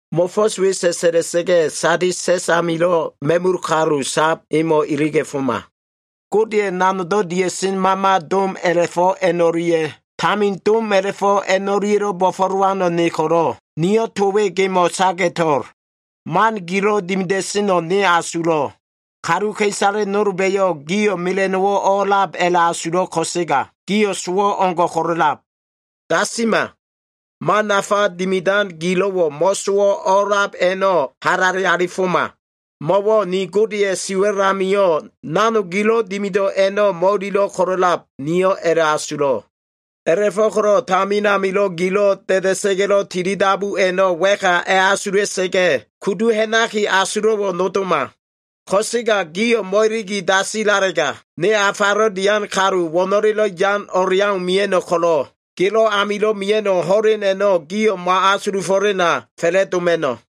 “Mo꞉fo꞉s we sa꞉sa꞉la꞉sa꞉ga꞉, Sadis sa꞉s amilo꞉ ma꞉mul kalu sab emo꞉ iliga꞉foma. Godeya꞉ nanogdo꞉ dia꞉sen mama dom a꞉la꞉fo꞉ a꞉no꞉lia꞉, tamin dom a꞉la꞉fo꞉ a꞉no꞉lia꞉lo꞉ bo꞉fo꞉lowano꞉ ne ko꞉lo꞉, niyo꞉ to we gemo꞉ saga꞉to꞉l. Man gilo꞉ dimida꞉seno꞉ ne asulo꞉. Kaluka꞉isale nolba꞉yo꞉ gio꞉ mela꞉no꞉wo꞉ o꞉lab a꞉la꞉asulab ko꞉sega, gio꞉ sowo꞉ o꞉ngo꞉ ko꞉lo꞉lab. Dasima! Man nafa dimidan gilo꞉wo꞉ mo꞉sowo꞉ o꞉lab a꞉no꞉ halale alifoma. Mo꞉wo꞉ ni Godeya꞉ siwa꞉l amio꞉ nanog gilo꞉ dimido꞉ a꞉no꞉ mo꞉ililo꞉ ko꞉lo꞉lab, niyo꞉ a꞉la꞉asulo꞉. A꞉la꞉fo꞉ko꞉lo꞉ tamin amilo꞉ gilo꞉ da꞉da꞉sa꞉ga꞉lo꞉ tilidabu a꞉no꞉ wa꞉ka a꞉asula꞉sa꞉ga꞉, kudu ha꞉naki asulo꞉wo꞉ nodoma. Ko꞉sega gio꞉ mo꞉iligi dasilalega, ne afalo꞉ dian kalu wo꞉no꞉lelo꞉ yan o꞉leau mia꞉no꞉ ko꞉lo꞉, gelo꞉ amilo꞉ mia꞉no꞉ ho꞉len a꞉no꞉ gio꞉ mo꞉asulufo꞉lena fa꞉la꞉doma꞉no꞉.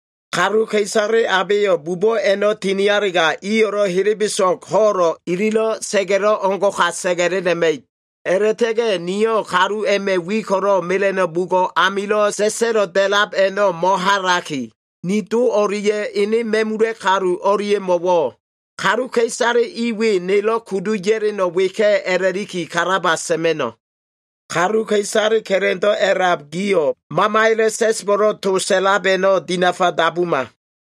Kaluka꞉isale abeyo꞉ bubo꞉ a꞉no꞉ tinialega, iyo꞉lo꞉ helebeso꞉g ho꞉lo꞉, ililo꞉ sa꞉ga꞉lo꞉ o꞉ngo꞉ka sa꞉ga꞉lela꞉ma꞉ib. A꞉la꞉ta꞉ga꞉ niyo꞉ kalu a꞉ma꞉ wi ko꞉lo꞉ mela꞉no꞉ bugo꞉ amilo꞉ sa꞉sa꞉lo꞉ da꞉lab a꞉no꞉ mo꞉halaki, ni do o꞉lia꞉ ene ma꞉mula꞉ kalu o꞉lia꞉mo꞉wo꞉, ‘kaluka꞉isale i we nelo꞉ kudu ya꞉leno꞉ weka꞉’ a꞉la꞉liki kalaba sa꞉ma꞉no꞉. Kaluka꞉isale ka꞉la꞉ndo꞉ a꞉lab gio꞉ Mamaya꞉lo꞉ sa꞉sbo꞉lo꞉ to sa꞉lab a꞉no꞉ dinafa dabuma.”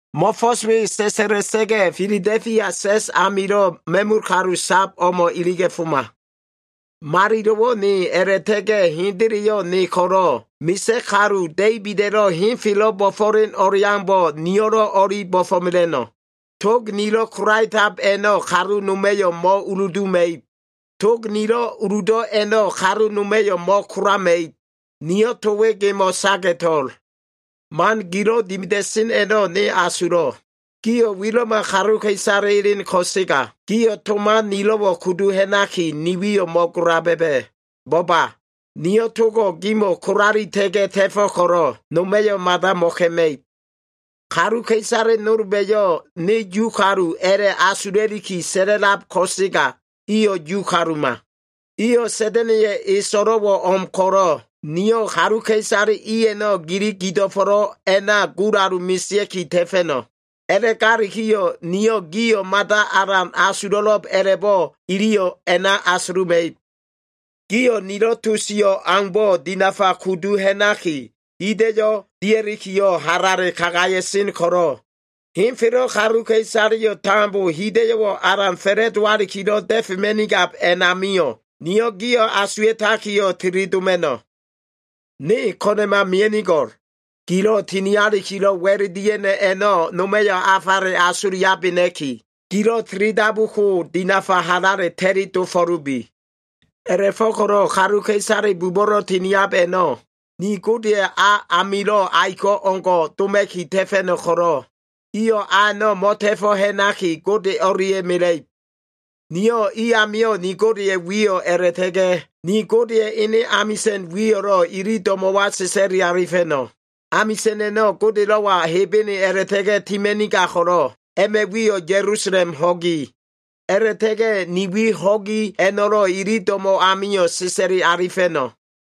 “Mo꞉fo꞉s we sa꞉sa꞉la꞉sa꞉ga꞉ Filado꞉fia sa꞉s amilo꞉ ma꞉mul kalu sab o꞉mo꞉ iliga꞉foma. Malilo꞉wo꞉ ne a꞉la꞉ta꞉ga꞉ hendeleyo꞉ ne ko꞉lo꞉, misa꞉ kalu Da꞉ibida꞉lo꞉ henfelo꞉ bo꞉fo꞉len o꞉leaumbo꞉, niyo꞉lo꞉ o꞉li bo꞉fo꞉mela꞉no꞉. Tog nilo꞉ kolaetab a꞉no꞉ kalu noma꞉yo꞉ mo꞉uluduma꞉ib. Tog nilo꞉ uludo꞉ a꞉no꞉ kalu noma꞉yo꞉ mo꞉kolama꞉ib. Niyo꞉ to we gemo꞉ saga꞉to꞉l. Man gilo꞉ dimida꞉sen a꞉no꞉ ne asulo꞉. Gio꞉ wilo꞉ma kaluka꞉isale elen ko꞉sega, gio꞉ to man nilo꞉wo꞉ kudu ha꞉naki, ni wiyo꞉ mo꞉gola ba꞉ba꞉. Bo꞉ba! Niyo꞉ togo꞉ gimo꞉wo꞉ kolalita꞉ga꞉ ta꞉fo꞉ ko꞉lo꞉, noma꞉yo꞉ mada mo꞉ka꞉ma꞉ib. Kaluka꞉isale nolba꞉yo꞉ ‘ne Yu kalu’ a꞉la꞉asula꞉liki sa꞉la꞉lab ko꞉sega, iyo꞉ Yu kaluma. Iyo꞉ Sa꞉da꞉na꞉ya꞉ e so꞉lo꞉wo꞉ o꞉m ko꞉lo꞉, niyo꞉ kaluka꞉isale i a꞉no꞉ gili gido꞉fo꞉lo꞉ a꞉na gulalu mesea꞉ki ta꞉fa꞉no꞉. A꞉la꞉galikiyo꞉ niyo꞉ gio꞉ mada alan asulo꞉lo꞉b a꞉la꞉bo꞉, iliyo꞉ a꞉na asuluma꞉ib. Gio꞉ nilo꞉ to sio꞉ aumbo꞉ dinafa kudu ha꞉naki, hida꞉yo꞉ dia꞉likiyo꞉ halale kagaya꞉sen ko꞉lo꞉, henfelo꞉ kaluka꞉isaleyo꞉ tambo hida꞉yo꞉wo꞉ alan fa꞉la꞉dowakilo꞉ da꞉fema꞉nigab a꞉namio꞉, niyo꞉ gio꞉ asuwa꞉takiyo꞉ tili doma꞉no꞉. Ne ko꞉na꞉ma mia꞉nigo꞉l. Gilo꞉ tinialikilo꞉ wa꞉l dia꞉no꞉ a꞉no꞉ noma꞉yo꞉ afale asuliabena꞉ki, gilo꞉ tilidabu ko dinafa halale ta꞉li dofo꞉lubi. A꞉la꞉fo꞉ko꞉lo꞉ kaluka꞉isale bubo꞉lo꞉ tiniab a꞉no꞉, ni Godeya꞉ a amilo꞉ aiko꞉ o꞉ngo꞉ doma꞉ki ta꞉fa꞉no꞉ ko꞉lo꞉, iyo꞉ a a꞉no꞉ mo꞉ta꞉fo꞉ ha꞉naki, Gode o꞉lia꞉ mela꞉ib. Niyo꞉ i amio꞉ ni Godeya꞉ wiyo꞉ a꞉la꞉ta꞉ga꞉, ni Godeya꞉ ene amisa꞉n wiyo꞉lo꞉ ili do꞉mo꞉wa sa꞉sa꞉li alifa꞉no꞉. Amisa꞉n a꞉no꞉ Godelo꞉wa Hebene a꞉la꞉ta꞉ga꞉ tima꞉nigab ko꞉lo꞉, a꞉ma꞉ wiyo꞉ Ya꞉lusalem Ho꞉gi. A꞉la꞉ta꞉ga꞉ ni wi ho꞉gi a꞉no꞉lo꞉ ili do꞉mo꞉ amio꞉ sa꞉sa꞉li alifa꞉no꞉.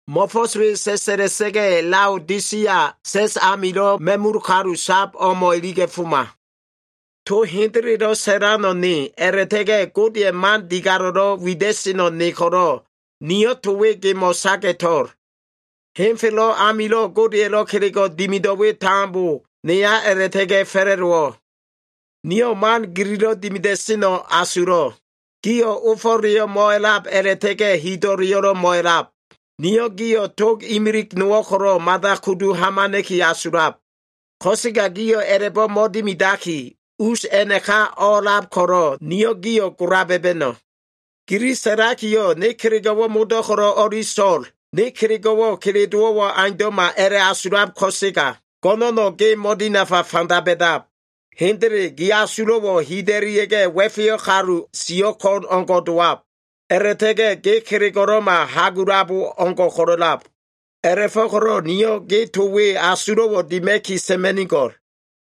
“Mo꞉fo꞉s we sa꞉sa꞉la꞉sa꞉ga꞉ Laodisia sa꞉s amilo꞉ ma꞉mul kalu sab o꞉mo꞉ iliga꞉foma. To hendelelo꞉ sa꞉lano꞉ ne, a꞉la꞉ta꞉ga꞉ Godeya꞉ man digalo꞉lo꞉ wida꞉seno꞉ ne ko꞉lo꞉, niyo꞉ to we gemo꞉ saga꞉to꞉l. Henfelo꞉ amilo꞉ Godeya꞉lo꞉ kelego꞉ dimido꞉ we tambo neya a꞉la꞉ta꞉ga꞉ fa꞉la꞉dowo꞉. Niyo꞉ man gililo꞉ dimida꞉seno꞉ asulo꞉l. Gio꞉ ofo꞉leyo꞉ mo꞉alab a꞉la꞉ta꞉ga꞉ hido꞉leyo꞉lo꞉ mo꞉alab. Niyo꞉ gio꞉ tog imilig nowo꞉ ko꞉lo꞉ mada kudu hamana꞉ki asulab. Ko꞉sega gio꞉ a꞉la꞉bo꞉ mo꞉dimidaki, us a꞉naka o꞉a꞉lab ko꞉lo꞉, niyo꞉ gio꞉ gola ba꞉ba꞉no꞉. Gili sa꞉lakiyo꞉, ‘Ne kelego꞉wo꞉ modo꞉ ko꞉lo꞉ o꞉li so꞉l. Ne kelego꞉wo꞉ kelelowo꞉wo꞉ aundo꞉ma’ a꞉la꞉asulab ko꞉sega, go꞉no꞉no꞉ ge mo꞉dinafa fanda ba꞉dab. Hendele gi asulo꞉wo꞉ hida꞉lia꞉ga꞉, wa꞉feyo꞉ kalu, siyo꞉ ko꞉n o꞉ngo꞉ dowab. A꞉la꞉ta꞉ga꞉ ge kelego꞉lo꞉ma, hagulabo o꞉ngo꞉ ko꞉lo꞉lab. A꞉la꞉fo꞉ko꞉lo꞉ niyo꞉ ge to we asulo꞉wo꞉ dima꞉ki sa꞉ma꞉nigo꞉l.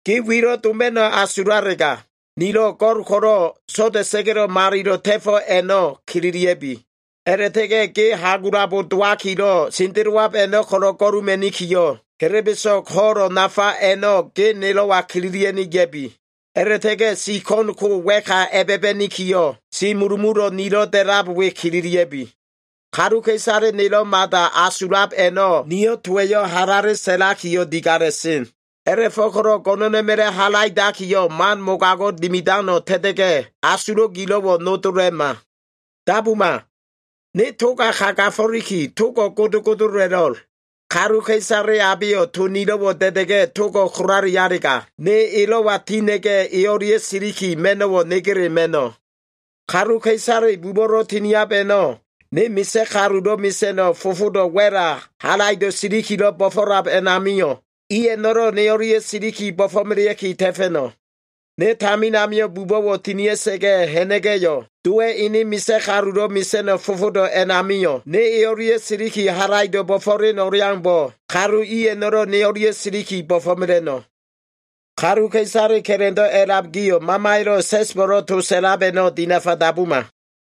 Ge wilo꞉ doma꞉no꞉ asulalega, nilo꞉ go꞉l ko꞉lo꞉ so꞉da꞉sa꞉ga꞉lo꞉ malilo꞉ ta꞉fo꞉ a꞉no꞉ kililia꞉bi. A꞉la꞉ta꞉ga꞉ ge hagulabo dowakilo꞉ sendelowab a꞉no꞉ ko꞉lo꞉ go꞉luma꞉nikiyo꞉, helebeso꞉g ho꞉lo꞉ nafa a꞉no꞉ ge nelo꞉wa kililia꞉ni ya꞉bi. A꞉la꞉ta꞉ga꞉ si ko꞉n ko wa꞉ka a꞉ba꞉ba꞉nikiyo꞉, si mulumulo꞉ nilo꞉ da꞉lab we kililia꞉bi. Kaluka꞉isale nelo꞉ mada asulab a꞉no꞉ niyo꞉ towa꞉yo꞉ halale sa꞉lakiyo꞉ digala꞉sen. A꞉la꞉fo꞉ko꞉lo꞉ go꞉no꞉na꞉ma꞉la꞉ halaidakiyo꞉, man mogago꞉ dimidano꞉ ta꞉ta꞉ga꞉, asulo꞉ gilo꞉wo꞉ nodola꞉ma. Dabuma! Ne toga kagafo꞉liki, togo꞉ godogodo a꞉la꞉lo꞉l. Kaluka꞉isale abeyo꞉ to nilo꞉wo꞉ da꞉da꞉ga꞉ togo꞉ kolalialega, ne elo꞉wa tina꞉ga꞉, e o꞉lia꞉ siliki ma꞉no꞉wo꞉ negele ma꞉no꞉. Kaluka꞉isale bubo꞉lo꞉ tiniab a꞉no꞉, ne misa꞉ kalulo꞉ mesa꞉no꞉ fofodo꞉ wa꞉la halaido꞉ silikilo꞉ bo꞉fo꞉lab a꞉namio꞉, i a꞉no꞉lo꞉ ne o꞉lia꞉ siliki bo꞉fo꞉melea꞉ki ta꞉fa꞉no꞉. Ne tamin amio꞉ bubo꞉wo꞉ tinia꞉sa꞉ga꞉ ha꞉na꞉ga꞉yo꞉, Dowa꞉ ene misa꞉ kalulo꞉ mesa꞉no꞉ fofodo꞉ a꞉namio꞉ ne e o꞉lia꞉ siliki, halaido꞉ bo꞉fo꞉len o꞉leaumbo꞉, kalu i a꞉no꞉lo꞉ ne o꞉lia꞉ siliki bo꞉fo꞉mela꞉no꞉. Kaluka꞉isale ka꞉la꞉ndo꞉ a꞉lab gio꞉ Mamaya꞉lo꞉ sa꞉sbo꞉lo꞉ to sa꞉lab a꞉no꞉ dinafa dabuma.”